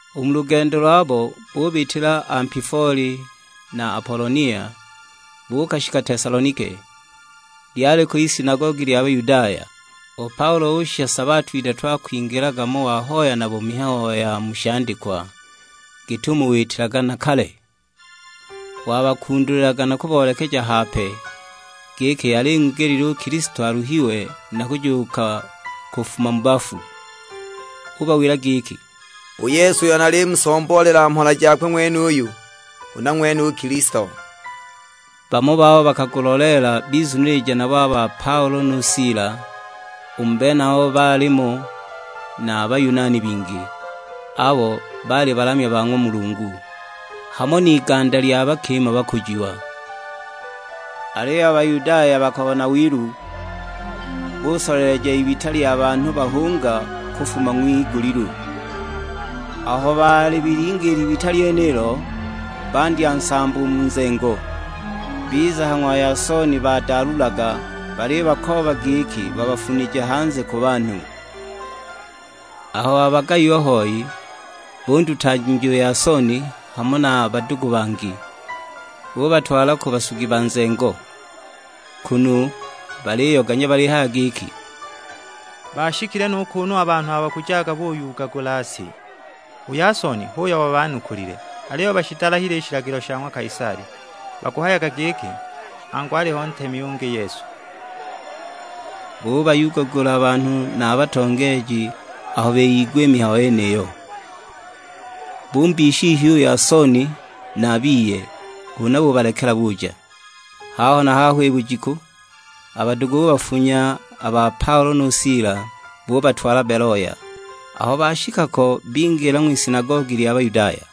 U mu lugendo lwabo bubitila Ampifoli na Apolonia, buukashika Tesalonike, lyaliko isinagogi lya Bayudaya. U Paulo ushisha sabato idatu akwingilaga mo wahoya nabo mihayo ya mu shandikwa, git'umo witilaga na kale. Wabakundulilaga na kuboolekeja hape, giki yali ing'wigelile u Kilisto aluhiwe na kujuuka kufuma mu bafu. Ubawila giki, "U Yesu uyo nalimusomboolela mhola jakwe ng'wenuyu, huna ng'wene u Kilisto." Bamo babo bakaguloleela bizunilija nabo a ba Paulo nu Sila; u mu benabo baalimo na Bayunani bingi, abo baali balamya ba ng'wa Mulungu, hamo n'iganda lya bakima bakujiwa. Aliyo a Bayudaya bakabona wilu, busoleleja ibita lya banhu bahunga kufuma ng'wigulilu. Aho balibilinga i libita lyenilo, bandya nsambo u mu nzengo. Biza ha ng'wa Yasoni badaalulaga, balibakooba giki babafunije hanze ku banhu. Aho babagayiwa hoi, bundutanja u Yasoni hamo na badugu bangi, bubatwala ku basugi ba nzengo; kunu baliyoganya balihaya giki, "Baashikile nu kuunu a banhu abo bakujaga buyugagula si; u Yasoni h'uyo wabanukulile. Aliyo bashidalahile i shilagilo sha ng'wa Kaisali, bakuhayaga giki angu aliho ntemi ungi Yesu!" Bubayuugagula a banhu na a batongeeji aho biyigwa i mihayo yeniyo. Bumbiisha ihyu u Yasoni na a biye, huna bubalekela buja. Haho na haho i bujiku, a badugu bubafunya a ba Paulo nu Sila, bubatwala Beloya; aho bashika ko bingila ng'wisinagogi lya Bayudaya.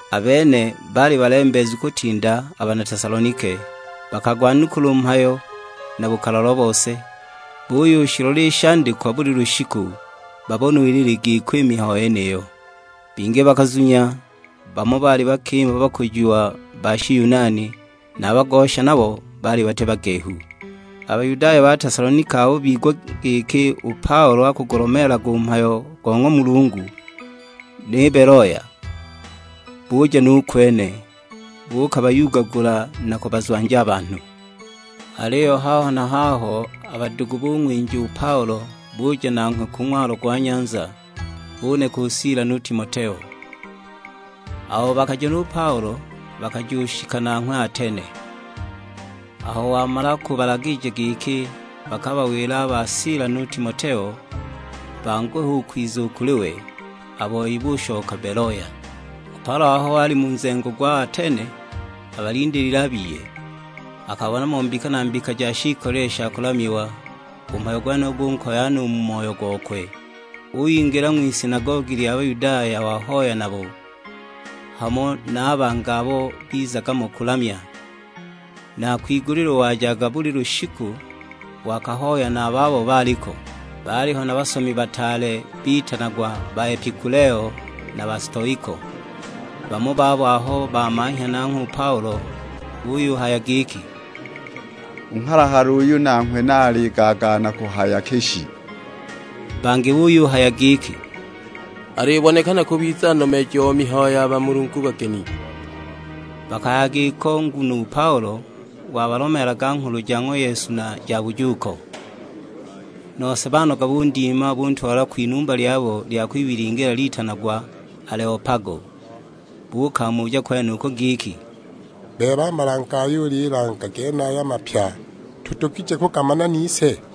A bene baali balembeezu kutinda a bana Tesalonike, bakagwanukula u mhayo na bukalalwa bose, buyushilola i shandikwa buli lushiku, babone ulu ili giko i mihayo yeniyo. Bingi bakazunya, bamo baali bakima bakujiwa ba Shiyunani, na a bagosha nabo baali bati bagehu. A Bayudaya ba Tesalonike aho bigwa giki u Paulo akugulomeelaga u mhayo go ng'wa Mulungu ni Beloya, buja nu kwene, buukabayugagula na kubazwanja a banhu. Aliyo haho na haho a badugu bung'winja u Paulo buja nanghwe ku ng'walo gwa nyanza, buneka u Sila nu Timoteo. Abo bakaja nu Paulo bakajushika nanghwe Atene. Aho wamala kubalagija giki bakabawile a ba Sila nu Timoteo banguhe u kwiza u kuli we, a boi bushoka Beloya. U Paulo aho ali mu nzengo gwa Atene abalindiilile a biye, akabona mo mbika na mbika ja shiikolile sha kulamiwa; u mhayo gwenuyo gunkoya no u mu moyo gokwe! Uyingila ng'wisinagogi lya Bayudaya wahoya nabo, hamo na a bangi abo bizaga mo kulamya. Na kwigulilu wajaga buli lushiku wakahoya na a babo baaliko. Baaliho na basomi bataale, bitanagwa Baepikuleo na Bastoiko; bamo babo aho bamanhya nanghwe u Paulo buyuhaya giki, "U nghalahala uyu nanghwe ni aligaagaana kuhaya ki shi?" Bangi buyuhaya giki, "Alibonekana kubiza nomeeji o mihayo ya bamulungu bageni!" Bakahaya giko nguno u Paulo wabalomeelaga nghulu ja ng'wa Yesu na ja bujuuko. Nose banoga bundima, buntwala kwinumba lyabo lya kwibilingila litanagwa Aleo-Pago; buukamuja kwenuko giki, "Bebe a malange ayo ulilanga genaya mapya, tudugije kugamana nise?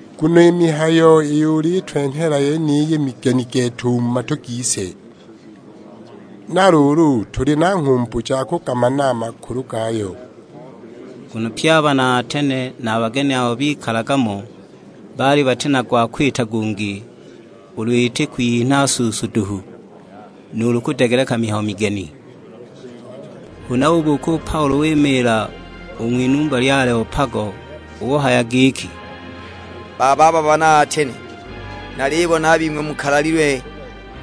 Nguno i mihayo iyo ulitwenhela yeniyi, migeni gete u mu matu gise! Na luulu tuli na nghumbu ja kugamana a makulu gayo!" Nguno pye a bana Atene na a bageni abo bikalaga mo baali bati na gwa kwita gungi, ulu iti kwiyinha suusu duhu, nuulu kudegeleka mihayo migeni. Huna ubuuka u Paulo wimiila u ng'winumba lya Aleo-Pago; uhaya giki, "Bababa bana Atene, nalibona a bing'we mukalalilwe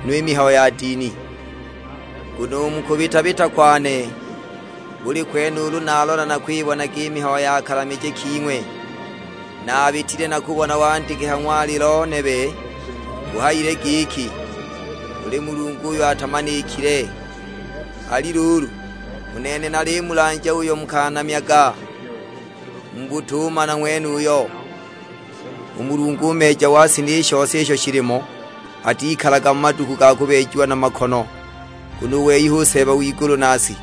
no i mihayo ya dini. Nguno u mu kubita-bita kwane, buli kwene ulu nalola nakwibonaga i mihayo ya kalamije king'we. Naabitile na kubona wandike ha ng'walilo nebe buhayile giki, 'Kuli Mulungu uyo atamanikile.' Ali luulu, u nene nalimulanja uyo mukanamyaga mu butumana ng'wenuyo. U Mulungu u Meeja wa si ni shose isho shilimo, atikalaga mu maduku ga kubeejiwa na makono, nguno u wei hu Seeba w'igulu na si.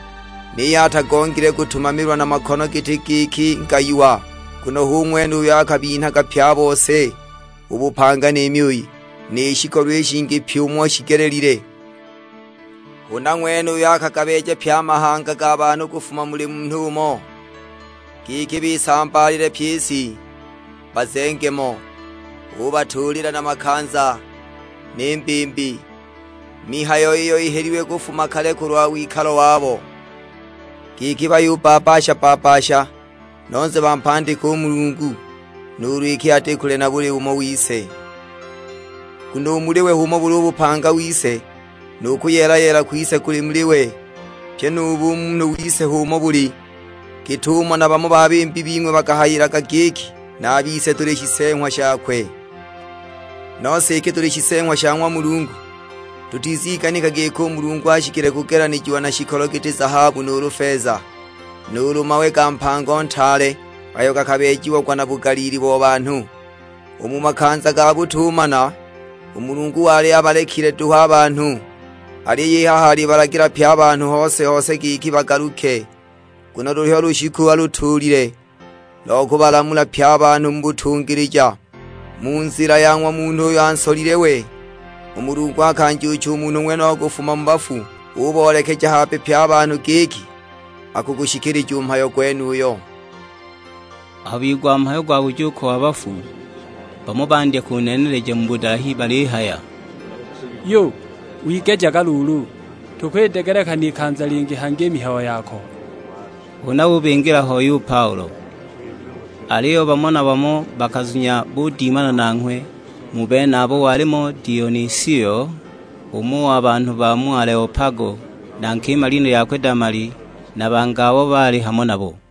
Niyo atagongile kutumamilwa na makono giti giki ngayiwa, nguno hu ng'wene uyo akabinhaga pye a bose u bupanga ni myuyi, ni shikolo i shingi pyi umo shigelelile. Huna ng'wene uyo akagabeeja pye a mahanga ga banhu kufuma muli munhu umo, giki bisambaalile pyi i si, bazenge mo. Ubatuulila na makanza, ni mbimbi: mihayo iyo ihelilwe kufuma kale kulwa wikalo wabo; giki bayubbabbasha-bbabbasha, nose bampandike u Mulungu, nuulu iki ati kule na buli umo wise. Nguno u muli we h'umo buli u bupanga wise, nu kuyeela-yeela kwise kuli muli we. Pyi nu bumunhu wise h'umo buli, git'umo na bamo ba bimbi bing'we bakahayilaga giki, 'Na a bise tuli shiseeng'wa shakwe.' Nose iki tuli shiseeng'wa sha ng'wa Mulungu, tutiziganika giki u Mulungu ashikile kugelanijiwa na shikolo giti zahabu nuulu feza, nuulu mawe ga mpango ntaale ayo gakabeejiagwa na bugaliili bo banhu. U mu makanza ga butumana, u Mulungu wali abalekile duhu a banhu, aliyo i haha alibalagila pye a banhu hose-hose giki bagaluke. Nguno luliho lushiku alutuulile, lo kubalamula pye a banhu mu butungilija, mu nzila ya ng'wa Munhu uyo ansolile we. U Mulungu akanjuucha u Munhu ng'wenuyo kufuma mu bafu, uboolekeja hape pye a banhu giki akugushikilija u mhayo gwenuyo." Aho bigwa mhayo gwa bujuuko wa bafu, bamo bandya kuneeneleja mu budalahi balihaya, "Yu, wigejaga luulu, tukwidegeleka n'ikanza lingi hangi i mihayo yako!" Huna ubingila hoi u Paulo. Aliyo bamo na bamo bakazunya budimana nanghwe; mu benabo walimo Dionisio, umo wa banhu ba mu Aleo-Pago, na nkima lina lyakwe Damali, na bangi abo baali hamo nabo.